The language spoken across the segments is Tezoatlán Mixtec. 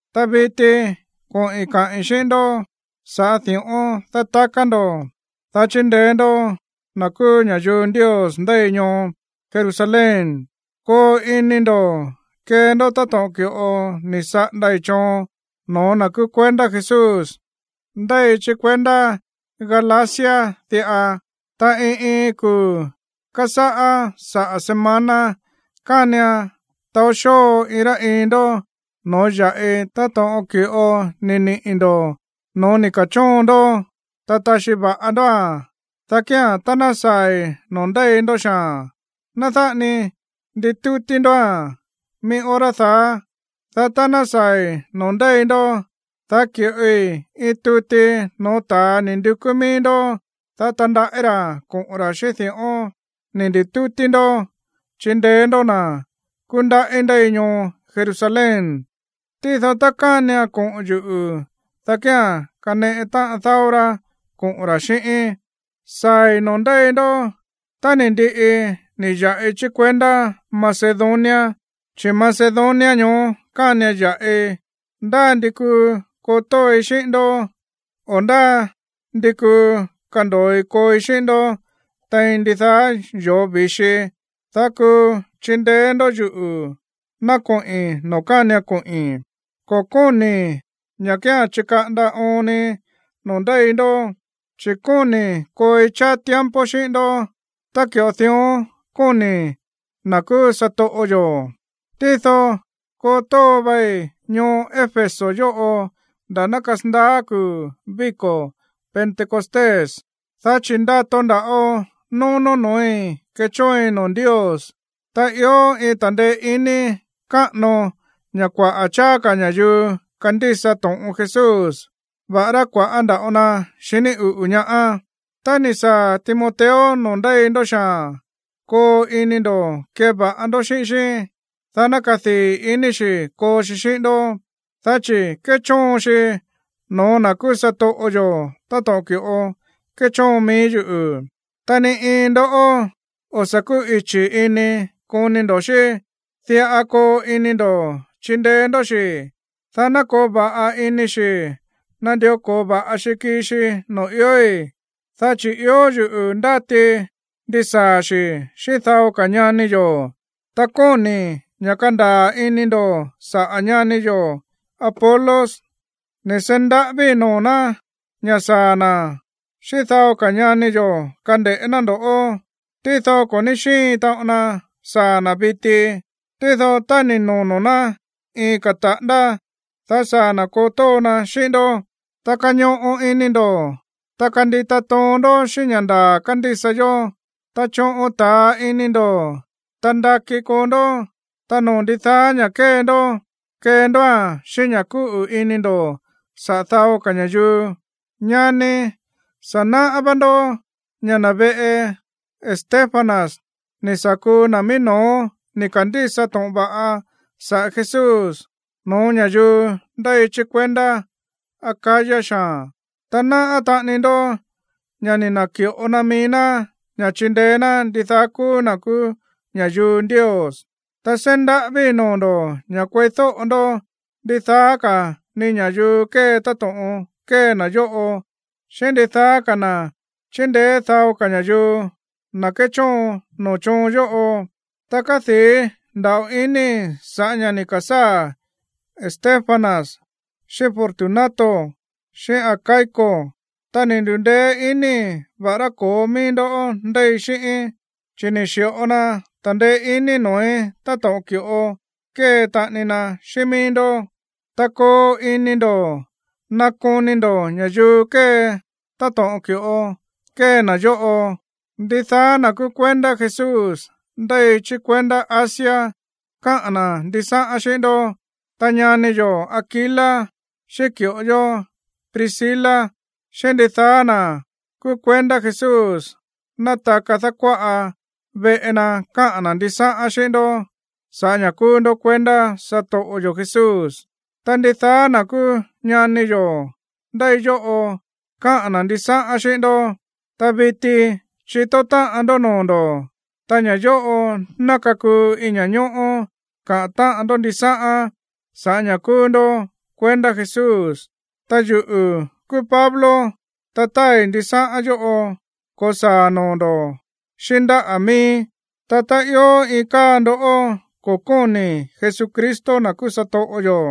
Ta viti koꞌi̱n kaꞌi̱n xíꞌín ndó sa̱ꞌá di̱ꞌón dátaká ndo̱, dá chindeé ndó na̱ kúú ña̱yuu Ndios ndéi ñoo Jerusalén. Koo ini ndo̱ kee ndó táto̱ꞌon ki̱ꞌo ni̱ saꞌandai̱ choon no̱ó na̱ kúú kuendá Jesús ndéi chí kuendá Galacia diꞌa. Ta iin iin kuu̱ kasáꞌá saꞌa̱ semana, kánian taó xóo iin rá iin ndó no̱ó ya̱ꞌi táto̱ꞌon ki̱ꞌo ni̱ niꞌi̱ ndo̱ no̱ó ni̱ ke̱chóon ndó, ta taxi va̱ꞌa ndóa̱n. Dá kía̱n tá ná saa̱i̱ noo̱ ndéi ndó xaa̱n, ná dáꞌa ni nditútí ndóa̱n mií hora daá. Dá tá ná saa̱i̱ noo̱ ndéi ndó, dá ki̱ꞌoi iin tuti no̱ó ta̱a ni̱ ndukú mií ndó, dá tandaꞌí ra̱ koꞌo̱n ra̱ xíꞌín di̱ꞌón ni̱ ndi̱tútí ndó chindeé ndó na̱ kúndaꞌí ndéi ñoo Jerusalén. Tído tá kánian koꞌo̱n yuꞌu̱, dá kía̱n kaneꞌe táꞌan dáó rá koꞌo̱n ra̱ xíꞌíín. Saa̱i̱ noo̱ ndéi ndó tá ni̱ ndiꞌi ni̱ ya̱ꞌi chí kuendá Macedonia, chi̱ Macedonia ñoó kánian ya̱ꞌi. Ndá ndi kuu koo tóoi xíꞌín ndó, o ndá ndi kuu kando̱oi kooi xíꞌín ndó tein ndidaá yoo̱ vi̱xi, dá kuu chindeé ndó yuꞌu̱ ná koꞌi̱n noo̱ kánian koꞌi̱n. Ko̱ kóni̱i̱ ña̱ kía̱n chikaꞌanda oon ni noo̱ ndéi ndó, chi̱ kóni̱i̱ kooi cháá tiempo xíꞌín ndó tá ki̱ꞌo dión kóni̱ na̱ kúú satoꞌo yo̱. Tído koo tóo vai ñoo Éfeso yóꞌo nda̱ ná kasandaá kuu̱ víko̱ Pentecostés, dá chi̱ ndato nda̱ꞌo nónó no̱ói̱ kechóoin noo̱ Ndios, ta ió iin ta̱ndeé iní káꞌano ña̱ kuaꞌa̱ cháá ka̱ ña̱yuu kandísa to̱ꞌon Jesús, va̱ꞌará kua̱ꞌá nda̱ꞌo na xiní uꞌu̱ ñaá. Tá ni̱ saa̱ Timoteo noo̱ ndéi ndó xaa̱n, koo ini ndo̱ keva̱ꞌa ndó xíꞌín xí, dá ná kadii̱ ini xi̱ koo xi xíꞌín ndó, dá chi̱ kéchóon xi no̱ó na̱ kúú satoꞌo yo̱ táto̱ꞌon ki̱ꞌo kéchóon mií yuꞌu̱. Ta ni iin ndó o̱ sa̱ kúꞌichi̱ ini koni ndo̱ xí. Diꞌa koo ini ndo̱ chindeé ndó xi̱, dá ná koo va̱ꞌa ini xi̱ nandió ko̱o va̱ꞌa xi kii xi noo̱ iói̱, dá chi̱ ió yuꞌu̱ ndátii ndisaa̱ xi̱ xíꞌín dao ka̱ ñani yo̱. Ta kóni̱i̱ ña̱ kandaa̱ ini ndo̱ saꞌa̱ ñani yo̱ Apolos. Ni̱ seí ndaꞌávíi̱ noo̱ ná ña̱ saa̱ na̱ xíꞌín dao ka̱ ñani yo̱ kande̱ꞌé ná ndo̱ꞌó. Tído ko̱ ní xíin taꞌon na saa̱ na̱ viti. Tído tá ni̱ nono̱ ná iin ka̱ taꞌándá, dá saa̱ na̱ koo tóo na xíꞌín ndó. Ta kañoꞌo ini ndo̱, ta kandita toon ndó xíꞌín ña̱ ndaa̱ kándísa yó, ta choꞌon ta̱a ini ndo̱, ta ndakí koo ndó. Ta noo̱ ndidaá ña̱ kée ndó, kee ndóa̱n xíꞌín ña̱ kúꞌu̱ ini ndo̱ saꞌa̱ dao ka̱ ña̱yuu. Ñani, sa̱ náꞌá vá ndó ña̱ na̱ veꞌe Estéfanas ni̱ sa̱ kuu na̱ mií no̱ó ni̱ ka̱ndísa to̱ꞌon va̱ꞌa saꞌa̱ Jesús no̱ó ña̱yuu ndéi chí kuendá Acaya xaa̱n. Ta náꞌá taꞌani ndó ña̱ ni̱ na̱ki̱ꞌo na mií ná ña̱ chindeé ná ndidaá kúú na̱ kúú ña̱yuu Ndios. Ta seí ndaꞌávíi̱ noo̱ ndo̱ ña̱ kueídóꞌo ndó ndidaá ka̱ ni ña̱yuu kée táto̱ꞌon kée na̱ yóꞌo, xíꞌín ndidaá ka̱ na̱ chíndeé dao ka̱ ña̱yuu, na̱ kéchóon noo̱ choon yóꞌo. Ta kádii̱ nda̱ꞌo inii̱ sa̱ꞌá ña̱ ni̱ ka̱sáa̱ Estéfanas, xíꞌín Fortunato, xíꞌín Acaico, ta ni̱ ndu̱ndeé iníi̱, va̱ꞌará ko̱ó mií ndó ndéi xíꞌíín, chi̱ ni̱ xi̱ꞌo na ta̱ndeé iní noo̱í táto̱ꞌon ki̱ꞌo kée taꞌani na xíꞌín míí ndó. Ta koo ini ndo̱ nakoni ndo̱ ña̱yuu kée táto̱ꞌon ki̱ꞌo kée na̱ yóꞌo. Ndidaá na̱ kúú kuendá Jesús ndéi chí kuendá Asia káꞌa̱n na̱ ndisáꞌán xíꞌín ndó. Ta ñani yo̱ Aquila, xíꞌín ki̱ꞌo yó Priscila, xíꞌín ndidaá na̱ kúú kuendá Jesús nátaka dákuáꞌa veꞌe na káꞌa̱n na̱ ndisáꞌán xíꞌín ndó sa̱ꞌá ña̱ kúú ndó kuendá satoꞌo yo̱ Jesús. Ta ndidaá na̱ kúú ñani yo̱ ndéi yóꞌo káꞌa̱n na̱ ndisáꞌán xíꞌín ndó. Ta viti chitó táꞌan ndó noo̱ ndo̱, ta ña̱ yóꞌo ná kakuu iin ña̱ñóꞌó kaꞌa̱n táꞌan ndó ndisáꞌán sa̱ꞌá ña̱ kúú ndó kuendá Jesús. Ta yuꞌu̱ kúú Pablo, ta táai ndisáꞌán yóꞌo ko̱saa̱ noo̱ ndo̱ xíꞌín ndáꞌa̱ mííí. Ta tá ió iin káa ndó ko̱ kóni̱ Jesucristo, na̱ kúú satoꞌo yo̱,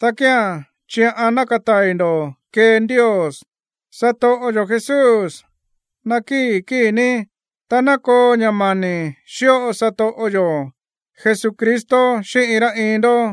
dá kía̱n chiꞌan ná katai̱ ndo̱ kee Ndios. Satoꞌo yo̱ Jesús, nakíi̱ kíi̱ ní. Ta ná koo ña̱ mani̱ xíꞌo satoꞌo yo̱ Jesucristo xíꞌín iin rá iin ndó.